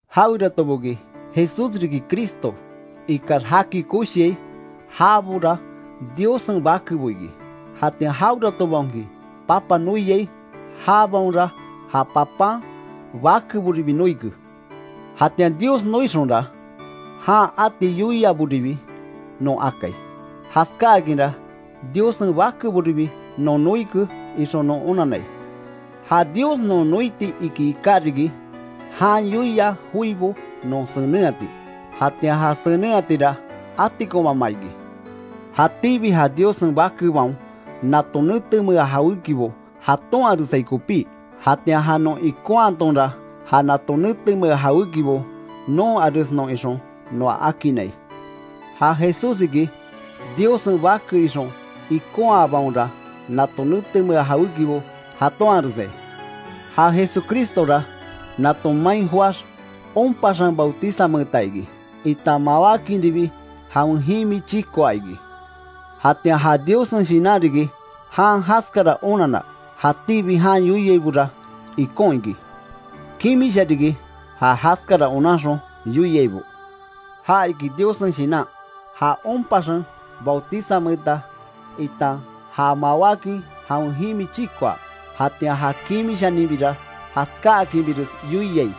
Jaweratoboki, Jesús riki Cristo, ikax jaki koshiai, jabora Diossen bakebo iki. Jatian jaweratobaonki Papa noiai, jabaonra ja Papan bakeboribi noike. Jatian Dios noixonra, jan ati yoiaboribi non akai, jaskákinra Diossen bakeboribi non noike ixon non onannai. Ja Dios non noiti iki iká riki, jan yoia joibo non senenhati, jatian ja senenhatira atikonmama iki. Jatíbi ja Diossen bakebaon, nato netemea jawékibo jatonharesai kopí. Jatian ja non ikonhatonra, ja nato netemea jawékibo nonharesnon ixon noa akinnai. Ja Jesús iki, Diossen Bake ixon ikonhabaonra, nato netemea jawékibo jatonharesai. Ja Jesucristora nato main joáx, onpaxen bautizameeta iki, itan mawákinribi jawen jimi chikoa iki. Jatian ja Diossen Shinan riki, jan jaskara onanna, jatíbi jan yoiaibora ikon iki. Kimisha riki, ja jaskara onanxon yoiaibo: Ja iki Diossen Shinan, ja onpaxen bautizameeta, itan ja mawákin jawen jimi chikoa. Jatian ja kimishaninbira jaskáakinbires yoiai.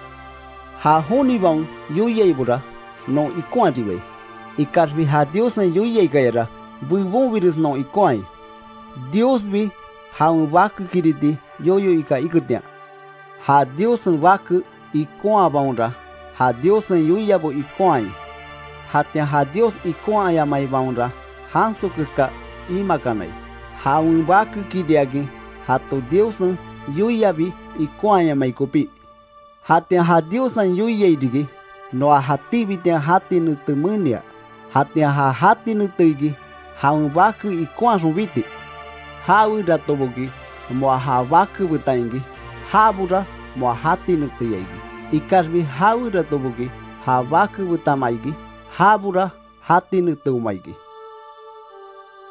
Ja jonibaon yoiaibora non ikonharibai, ikaxbi ja Diossen yoiaikayara, bebonbires non ikonhai, Diosbi jawen Bakekiriti yoyo ika iketian. Ja Diossen Bake ikonhabaonra, ja Diossen yoiabo ikonhai; jatian ja Dios ikonhayamaibaonra janso keska imakanai, jawen Bakekiriakin jato Diossen yoiabi ikonhayamai kopí. Jatian ja Diossen yoiai riki, noa jatíbitian jati nete menia, jatian ja jati nete iki jawen Bake ikonhaxon biti. Jaweratoboki moa ja Bake betan iki, jabora moa jati neteya iki, ikaxbi jaweratoboki ja Bake betanma iki, jabora jati neteoma iki.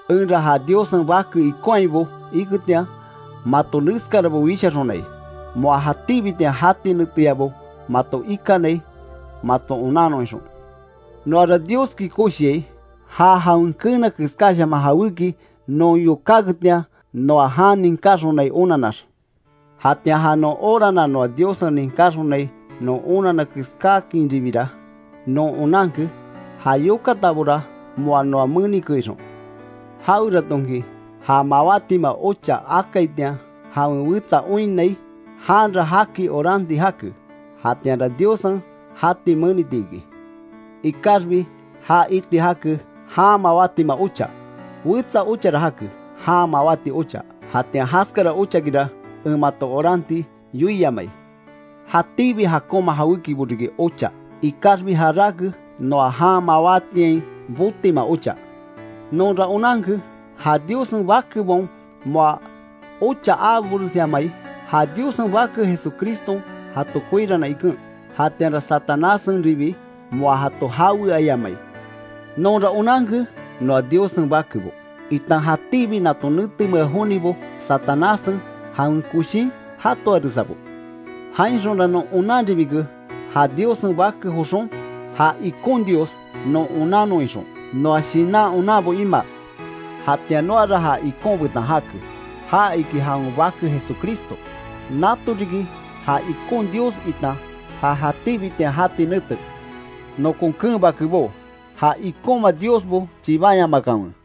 Enra ja Diossen Bake ikonhaibo iketian, mato neskarabo wishaxonai, moa jatíbitian jati neteyabo mato ikanai maton onannon ixon. Noara Dioski koshiai, ja jawen keena keskáshaman jawéki non yokáketian, noa jan ninkáxonai onannax. Jatian ja non orana noa Diossen ninkaxonai non onanna keskáakinribira, non onanke ja yokatabora moa noa menike ixon. Jaweratonki, ja mawátima ocha akaitian jawen wetsa oinnai, janra jaki oranti jake, jatianra Diossen jati meniti iki. Ikaxbi ja iti jake, jan mawátima ocha. Wetsa ochara jake, jan mawáti ocha. Jatian jaskara ochakira, en mato oranti yoiamai. Jatíbi jakonma jawékibo riki ocha, ikaxbi jaráke, noa jan mawátiain botima ocha. Nonra onanke, ja Diossen bakebaon moa ocha aaboresyamai, ja Diossen Bake Jesucriston jato koirana iken, jatianra Satanásenribi moa jato jaweayamai. Nonra onanke noa Diossen bakebo, itan jatíbi nato netemea jonibo Satanássen jawen koshin jatoaresabo. Jainxonra non onanribike, ja Diossen Bake joxon, ja ikon Dios non onannon ixon, noa shinan onanbo imaa. Jatian noara ja ikon betan jake, ja iki jawen Bake Jesucristo. Nato riki ja ikon Dios itan ja jatíbitian jati nete. Nokon keen bakebó, ja ikonma diosbo chibanyamakanwe.